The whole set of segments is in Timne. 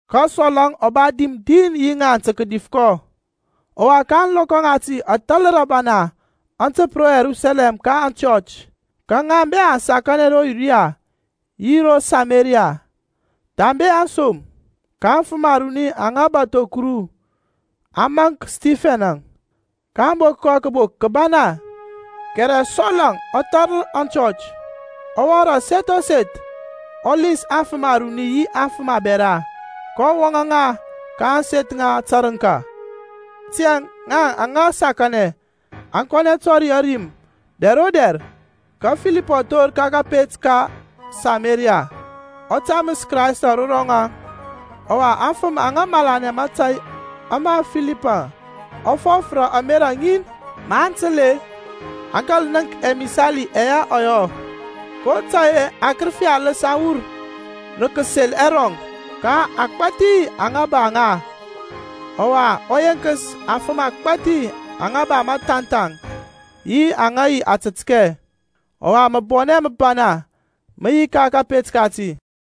Ka Sɔl-əŋ ɔ ba dim din yi ŋaŋ ta kadif kɔ. Ɔwa ka ȧŋlɔkɔ ŋati athalər abana aŋ təp ro Yerusalɛm ka aŋchɔch. Ka ŋa bɛ aŋ sakanɛ ro Yudia yi ro Samaria, thambe aŋsom. Ka afəm aruni aŋa bȧtho Kuru aŋ maŋk Stifɛn-əŋ, kaŋ bok kɔ kəbok kəbana. Kɛrɛ Sɔl-əŋ ɔ thalər aŋchɔch, ɔ wɔŋ rə aseth o seth, ɔ lins aŋfəm aruni yi aŋfəm abɛra, kɔ wɔŋȧ ŋa ka ȧŋseth ŋa tərəŋka. Tiyȧŋ ŋaŋ aŋa sakanɛ aŋ kɔnɛ kətɔri ȧrim-əŋ dɛr o dɛr. Ka Filip ɔ thor ka kȧpet ka Samaria, ɔ taməs Krayst ro rɔŋaŋ. Ɔwa aŋfəm aŋ malanɛ mȧtȧy ama Filipȧŋ ɔ fɔf rə ȧmerȧ ŋin, maŋ təl-e, aŋ kȧl nənk ɛmisali ɛyɛ ɔ yɔ. kotȧy-e akərəfi aləs aŋ wur rə kəsel ɛrɔŋ ka agbȧthi aŋa ba ŋa; ɔwa ɔ yenkəs afəm agbȧthi aŋa ba məthanthaŋ yi aŋa yi atətkɛ. Ɔwa məbɔnɛ məbana mə yi ka kȧpet kati.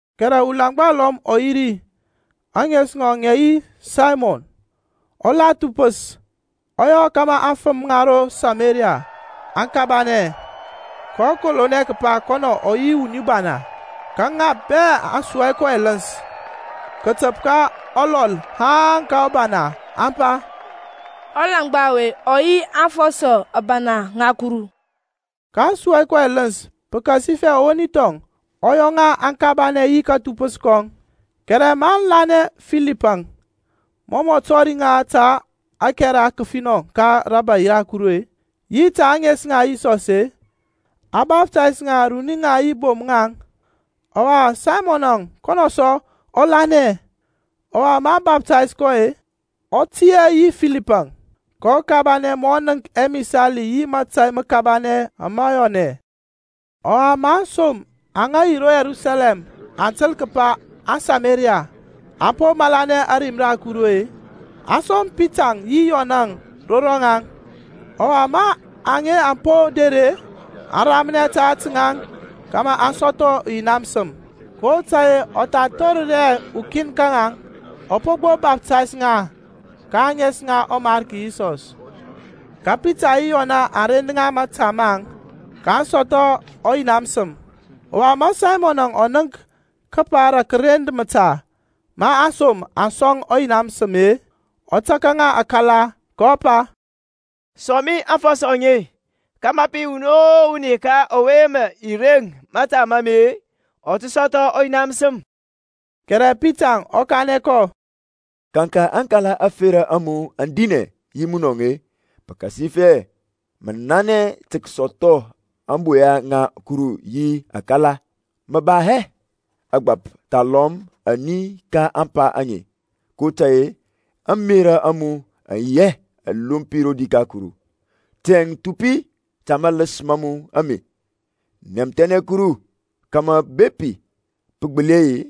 Kɛrɛ ulaŋgba ulɔm ɔ yi ri, ȧŋes ŋɔŋ ŋə yi Saymɔn, ɔ la thupəs, ɔ yɔ kȧmȧ aŋfəm ŋa ro Samaria aŋ kabanɛ, kɔ kolonɛ kəpa kɔnɔ ɔ yi wuni bana. Ka ŋa bɛ aŋ sua kɔ ɛləns kətəp ka ɔlɔl haŋ ka ɔbana, aŋ pa, Ɔlaŋgba ɔwe ɔ yi aŋfɔsɔ abana ŋa Kuru. kaŋ sua kɔ ɛləns pəkasifɛ ɔwoni thɔŋ ɔ yɔ ŋa aŋ kabanɛ yi kathupəs kɔŋ. Kɛrɛ maŋ lanɛ Filipȧŋ, mɔ mɔ tɔri ŋa ta ȧkɛra kəfinɔ ka rȧbȧy ra Kuru-e, yi ta ȧŋes ŋa Yisɔs-e, a baftays ŋa, runi-ŋaŋ yi bom-ŋaŋ. Ɔwa Saymɔnȧŋ, kɔnɔ sɔ ɔ lanɛ; ɔwa ma a baftays kɔ-e, ɔ tiyȧ yi Filipȧŋ, kɔ kabanɛ ma ɔ nənk ɛmisali yi mȧtȧy məkabanɛ ama yɔnɛ. Ɔwa ma aŋsom aŋa yi ro Yerusalɛm aŋ təl kəpa aŋSameriya aŋ po malanɛ ȧrim ra Kuru-e, aŋ som Pitaŋ yi Yɔnȧŋ ro rɔŋaŋ. Ɔwa ma aŋe aŋ po der-e, aŋ ramnɛ ta ȧtȧ ŋaŋ kȧmȧ aŋ sɔthɔ ɔYina məsəm, kotȧy-e ɔ tha thorər hɛ ukin ka ŋaŋ; a po gbo baftays ŋa ka ȧŋes ŋa ɔMarki Yisɔs. Ka Pitaŋ yi Yɔnȧŋ aŋ rend ŋa mȧta maŋ, kaŋ sɔthɔ ɔYina məsəm. Ɔwa ma Saymɔnȧŋ ɔ nənk kəpa rə kərend mȧta ma aŋsom a sɔŋ ɔYina məsəm-e, ɔ taka ŋa akala, kɔ pa, Sɔŋ mi aŋfɔsɔ aŋe kȧmȧ pə yi wuni o wuni ka ɔwe mə i reŋ mȧta ma mi-e, ɔ tə sɔthɔ ɔYina məsəm. Kɛrɛ Pitaŋ ɔ kanɛ kɔ, Kaŋka aŋkala ȧferȧ a mu aŋ dinɛ yi munɔŋ-e, pəkasifɛ mə nanɛ tə kəsɔthɔ ȧŋboya ŋa Kuru yi akala. Mə ba hɛ ȧgbȧp thalɔm ani ka ȧŋpa aŋe, kotȧy-e ȧŋmerȧ a mu aŋ yi hɛ alompi rodi ka Kuru. Tiyȧŋ thupi ta maləs ma mu ame, nɛmthɛnɛ Kuru, kȧmȧ bepi pə gbəli yi-e,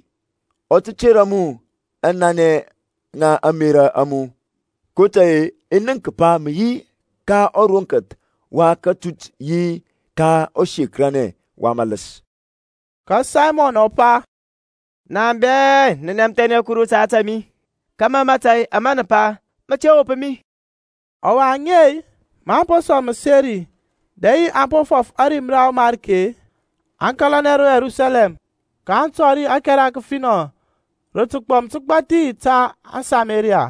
ɔ tə tera mu ȧŋnanɛ ŋa ȧŋmerȧ a mu. kotȧy-e i nənk kəpa mə yi ka ɔroŋkəth wa kȧtut yi ka ɔsekəranɛ wa mȧləs. Ka Saymɔn ɔ pa, Na bɛ, nɛmthɛnɛ nu Kuru ta ȧtȧ mi, kȧmȧ mȧtȧy ama nə pa mə te wop mi. Ɔwa ŋaŋ-e, maŋ po sɔŋ məseri, dɛ yi aŋ po fɔf ȧrim ra ɔMariki-e, aŋ kȧlanɛ ro Yerusalɛm, kaŋ tɔri ȧkɛra kəfinɔ rə təgbɔm təgbȧthi ta aŋSameriya.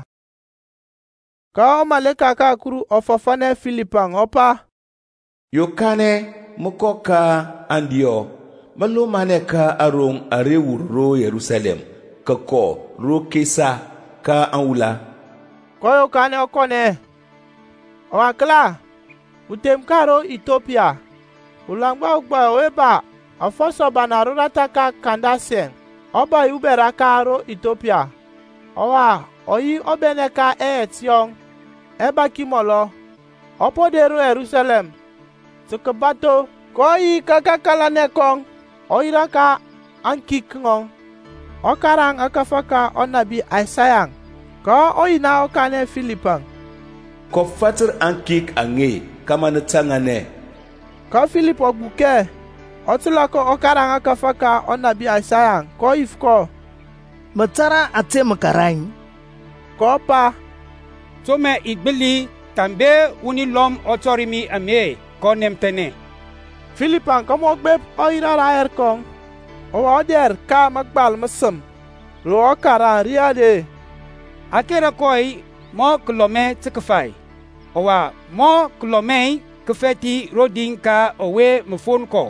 Ka ɔmaleka ka Kuru ɔ fɔfȧnɛ Filipȧŋ ɔ pa, Yokanɛ, mə kɔ ka aŋdiyɔ, mə lomanɛ ka aroŋ ara wur ro Yerusalɛm kəkɔ ro Kesa, ka aŋwula. kɔ yokanɛ ɔ kɔnɛ. Ɔwa kəla, uthem ka ro Ithiyopiya, ulaŋgba ugbai ɔwe ba afɔsɔ abana roratha ka Kandasɛŋ, ɔbȧy ubɛra ka ro Ithiyopiya, ɔwa ɔ yi ɔbɛnɛ ka ɛyɛt yɔŋ ɛbaki mɔlɔ, ɔ po der ro Yerusalɛm tə kəbatho. kɔ yi ka kakalanɛ kɔŋ, ɔ yirȧ ka aŋkik ŋɔŋ, ɔ karaŋ ȧkȧfȧ ka ɔnȧbi Isaya. Ka ɔYina ɔ kanɛ Filipȧŋ, Kɔ fatər aŋkik aŋe kȧmȧ nə taŋanɛ. Ka Filip ɔ gbukɛ, ɔ təlȧ kɔ ɔ karaŋ ȧkȧfȧ ka ɔnȧbi Isaya, kɔ yif kɔ, Mə tȧrȧ ȧte mə karaŋ-i? kɔ pa, To mə i gbəli thambe wuni lɔm ɔ tɔri mi-a? kɔ nɛmthɛnɛ Filipȧŋ kȧmȧ ɔ gbep ɔ yirȧ rayɛr kɔŋ. Ɔwa ɔdɛr ka mȧgbal məsəm ro ɔ karaŋ ri are, A kera kɔ mɔ kəlɔmɛ tə kəfai; Ɔwa mɔ kəlɔmɛ kəfɛth rodi ka ɔwe ma fon kɔ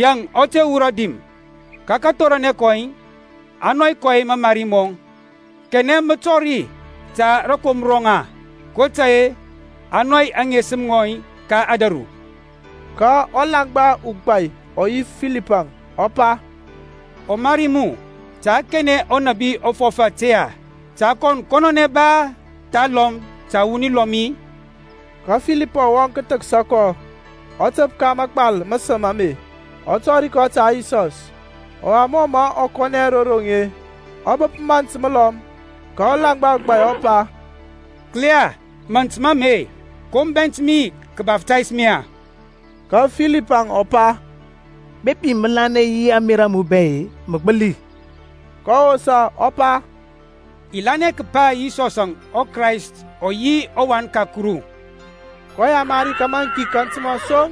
Yaŋ ɔ te wurɔ dim. Ka kathoranɛ kɔŋ a nɔy kɔ mamari mɔŋ; Kanɛ mə tɔri ta rȧkomra rɔŋ-e? kotȧy-e a nɔy aŋesəm ŋɔŋ ka ȧdȧru. Ka ɔlaŋgba ugbai ɔ yif Filipȧŋ, ɔ pa, Ɔmari mu, ta kanɛ ɔnȧbi ɔ fɔf ȧte-e? Ta kɔn kɔnɔnɛ ba, thalɔm ta wuni lɔm-i? Ka Filipȧŋ ɔ wɔŋ kəthəksa kɔ, ɔ təp ka mȧgbal məsəm ame, ɔ tɔri kɔ ta Yisɔs. Ɔwa mɔ mə aŋ kɔnɛ ro roŋ-e, aŋ bəp mȧnt məlɔm, ka ɔlaŋgba ugbai ɔ pa, Kəla, mȧnt mi ame, ko mə bɛnt kəbaptais mi-e? Ka Filipȧŋ ɔ pa, Bepi mə lanɛ yi ȧŋmerȧ a mu bɛ-e, mə gbəli. Kɔ wosa, ɔ pa, I lanɛ kəpa Yisɔs Krayst ɔ yi ɔWan ka Kuru. kɔ yamari kȧmȧ aŋkik aŋ təmȧ soŋ,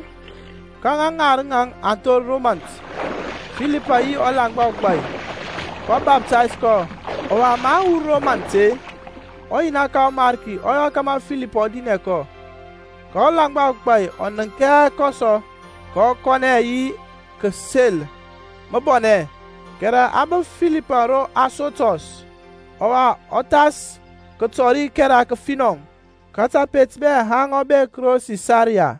ka ŋa ŋarəŋ aŋ thor ro mȧnt, Filipȧŋ yi ɔlaŋgba ugbai, kɔ baftays kɔ. Ɔwa maŋ wur ro mant-e, ɔYina ka ɔMarki ɔ yɔ kȧmȧ Filipȧŋ ɔ dinɛ kɔ, ka ɔlaŋgba ugbai ɔ nənk hɛ kɔ sɔ; kɔ kɔnɛ yi kəsel məbɔnɛ. Kɛrɛ a bəp Filipȧŋ ro Asotɔs. Ɔwa ɔ thas kətɔri ȧkɛra kəfinɔ ka tapet bɛ haŋ ɔ bek ro Sisaria.